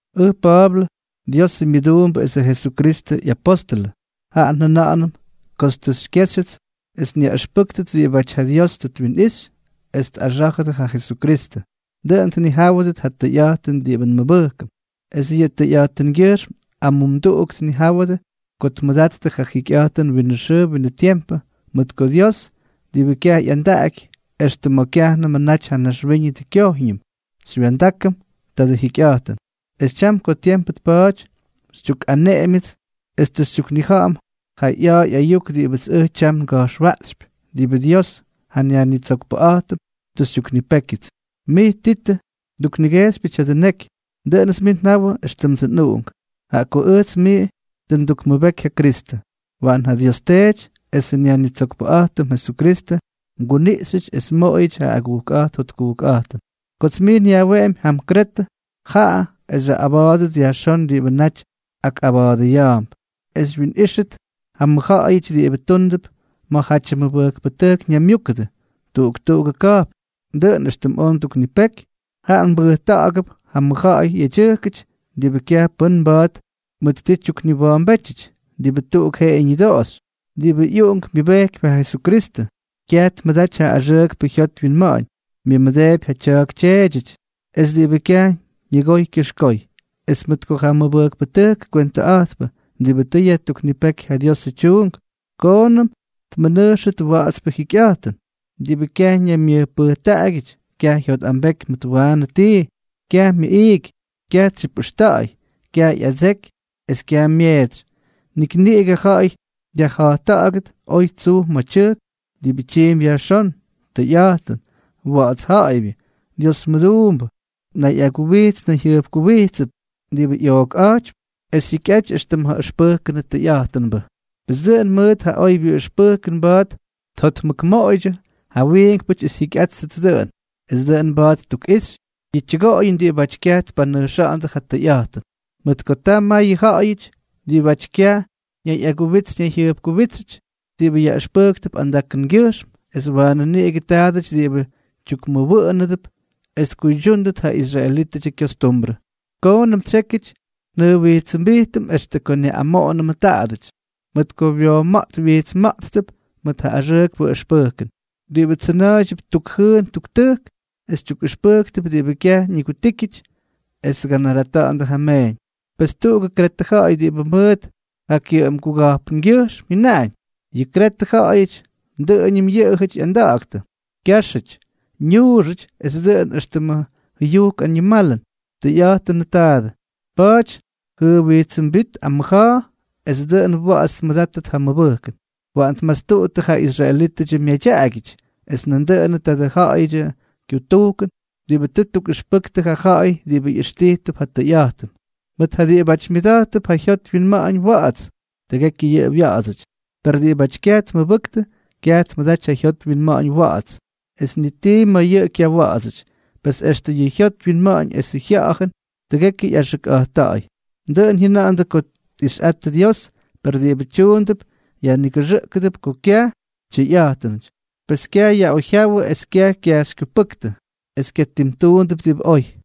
Ʉj Pa̱a̱blʉ, Diosʉ myʉduumbʉ esʉ Jesukristʉ ꞌyapóstʉlʉ, jaꞌa njʉna̱ꞌa̱nʉm kots tʉ xykyéxyʉts es nyaꞌʉxpʉ́kʉt diꞌibáty ja Dios tʉ twinꞌixy es tꞌaxá̱jʉdʉt ja Jesukristʉ, dʉꞌʉn tnijáwʉdʉt ja tʉyꞌa̱jtʉn diꞌibʉ nmʉbʉjkʉm, es yʉ tʉyꞌa̱jtʉngyʉjxm amumduꞌuk tnijáwʉdʉ ko tmʉdattʉ ja jikyꞌa̱jtʉn winʉ xʉʉ winʉ tiempʉ, mʉt ko Dios, diꞌibʉ kyaj ꞌyandaꞌaky, extʉ ma̱ kyajnʉmʉ naty ja naxwíñʉdʉ kyojñʉm xywya̱ndákʉm tadʉ jikyꞌa̱jtʉn, es tyam ko tiempʉ tpa̱a̱ty, xytyukꞌaneꞌemyʉts es tʉ xytyuknija̱ꞌa̱m ja ꞌya̱a̱ ꞌyayuk diꞌibʉts ʉj tyam nga̱jxwaꞌxypy, diꞌibʉ Dios, ja nYajnitsokpʉꞌa̱jtʉm, tʉ xytyuknipékyʉts. Mij Titʉ, nduknigejxypyʉ tya̱dʉ neky. Dʉꞌʉnʉts mij njawʉ éxtʉmdsʉ nꞌuꞌunk, jaꞌa ko ʉjts mij tʉ ndukmʉbeky ja Kristʉ. Waꞌan ja Dios Teety esʉ nYajnitsokpʉꞌa̱jtʉm Jesukristʉ mguniꞌxyʉty es mmoꞌoyʉty ja agujkꞌa̱jt jotkujkꞌa̱jtʉn. Kots mij nyajweꞌemy jam Kretʉ, jaꞌa es xyaꞌꞌaba̱a̱dʉt yajxón diꞌibʉ naty akꞌaba̱a̱dʉya̱a̱mp, es xywyinꞌíxʉt ja mʉjja̱ꞌa̱yʉty diꞌibʉ túndʉp ma̱jatyʉ mʉbʉjkpʉtʉjk ñaymyúkʉdʉ tuꞌuk tuꞌugʉ ka̱jpn, dʉꞌʉn éxtʉm oj nduknipeky. Jaꞌa mbʉjta̱ꞌa̱gʉp ja mʉjja̱ꞌa̱y yedyʉjkʉty diꞌibʉ kyaj pʉ́n mba̱a̱t mʉt ti tyukniwa̱a̱mbétyʉty, diꞌibʉ tuꞌuk jeꞌeyʉ ñʉdoꞌoxy, diꞌibʉ ꞌyuꞌunk myʉbejkypy ja Jesukristʉ, kyaj tmʉdaty ja axʉʉkpʉ jyot wyinma̱ꞌa̱ñ, myʉmʉdeepy ja tya̱a̱k tyeedyʉty, es diꞌibʉ kyaj ñʉgoy kyʉxkoy. Es mʉt ko ja mʉbʉjkpʉtʉjkʉ kywentʉꞌa̱jtpʉ diꞌibʉ tʉ yajtuknipéky ja Diosʉ tyuunk, koonʉm tmʉnʉjxʉt wa̱ꞌa̱dsʉ jyikyꞌa̱jtʉn, diꞌibʉ kyaj ñaymyʉjpʉjtaꞌagyʉty, kyaj jyotꞌambeky mʉt waanʉ tii, kyaj myʉꞌiiky, kyaj tsyipꞌʉxta̱ꞌa̱y, kyaj ꞌyadseky, es kyaj myeetsy; nik niꞌigʉ ja̱ꞌa̱y dyajja̱jtta̱ꞌa̱gʉt oy tsuj ma̱ tyʉjk, diꞌibʉ tyiimpy yajxón, tʉyꞌa̱jtʉn, wa̱ꞌa̱ts ja̱ꞌa̱ybyʉ, Dios mʉduumbʉ, nayꞌaguwijts nayjyʉjkuwijtsʉp, diꞌibʉ ꞌyookꞌa̱jtypy es jyikyꞌaty éxtʉm ja ʉxpʉjkʉnʉ tʉyꞌa̱jtʉnbʉ. Pes dʉꞌʉn mʉt ja oybyʉ ʉxpʉjkʉn mba̱a̱t tjotmʉkmoꞌoydyʉ ja wiinkpʉty es jyikyꞌátʉt dʉꞌʉn. Es nandʉꞌʉn mba̱a̱t ttukꞌixy yʉ tyʉgoꞌoyʉn diꞌibáty kyaj tpanʉjxa̱ꞌa̱ndʉ ja tʉyꞌa̱jtʉn. Mʉt ko ta mayʉ ja̱ꞌa̱yʉty diꞌibʉ kyaj ñayꞌaguwits ñayjyʉjkuwítsʉty diꞌibʉ yaꞌʉxpʉjktʉp andakʉngyʉjxm, es waanʉ niꞌigʉ ta̱a̱dʉty diꞌibʉ tyukkuwa̱ꞌa̱nʉdʉp es tkuydyúndʉt ja israelítʉdyʉ kyostumbrʉ. Koonʉm tsyékyʉty njʉjwijtsʉmbijtʉm extʉ ko nyaꞌꞌamoꞌonʉmʉ taadʉty, mʉt ko wyooma̱ꞌt wyijtsma̱ꞌttʉp mʉt ja axʉʉkpʉ ʉxpʉjkʉn, diꞌibʉ tsʉna̱a̱ydyʉp tukjʉʉn tuktʉjk, es tyukꞌʉxpʉjktʉp diꞌibʉ kyaj ñigutíkyʉty es tganarata̱ꞌa̱ndʉ ja meeñ. Pes tuꞌugʉ Kretʉ ja̱ꞌa̱y diꞌibʉ mʉt ja kyʉꞌʉmguga̱jpngyʉjxm jyʉnáñ: “Yʉ Kretʉ ja̱ꞌa̱yʉty, dʉꞌʉñʉm yʉꞌʉjʉty ꞌyanda̱ꞌa̱ktʉ, kyáxʉty, ñuuxʉty es dʉꞌʉn éxtʉmʉ jʉyujk añimalʉn.” Tʉyꞌa̱jtʉnʉ taadʉ. Pa̱a̱ty jʉjwijtsʉmbít amʉja̱a̱, es dʉꞌʉn wa̱ꞌa̱ts tmʉdáttʉt ja mʉbʉjkʉn. Waꞌan tmastuꞌuttʉ ja israelítʉdyʉ myadyaꞌagyʉty, es nandʉꞌʉnʉ tadʉ ja̱ꞌa̱yʉdyʉ kyutujkʉn diꞌibʉ tʉ ttukꞌʉxpʉktʉ ja ja̱ꞌa̱y diꞌibʉ ꞌyʉxtijtʉp ja tʉyꞌa̱jtʉn. Mʉt ja diꞌibáty myʉda̱jttʉp ja jyot wyinma̱ꞌa̱ñ wa̱ꞌa̱ts, tʉgekyʉ yʉꞌʉ wya̱ꞌa̱dsʉty; per diꞌibáty kyaj tmʉbʉktʉ, kyaj tmʉdaty ja jyot wyinma̱ꞌa̱ñ wa̱ꞌa̱ts, es ni tii ma̱ yʉꞌʉ kyawa̱ꞌa̱dsʉty. Pes extʉ yʉ jyot wyinma̱ꞌa̱ñ esʉ jya̱ꞌa̱jʉn tʉgekyʉ ꞌyaxʉkꞌa̱jtta̱ꞌa̱y. Dʉꞌʉn jyʉna̱ꞌa̱ndʉ ko tꞌixyꞌattʉ Dios, per diꞌibʉ tyuundʉp yajnigʉxʉꞌkʉdʉp ko kyaj tyʉyꞌa̱jtʉnʉty; pes kyayaꞌoyjyáwʉdʉ es kyaj kyajxykyupʉ́ktʉ, es kyatimtuundʉp diꞌibʉ oy.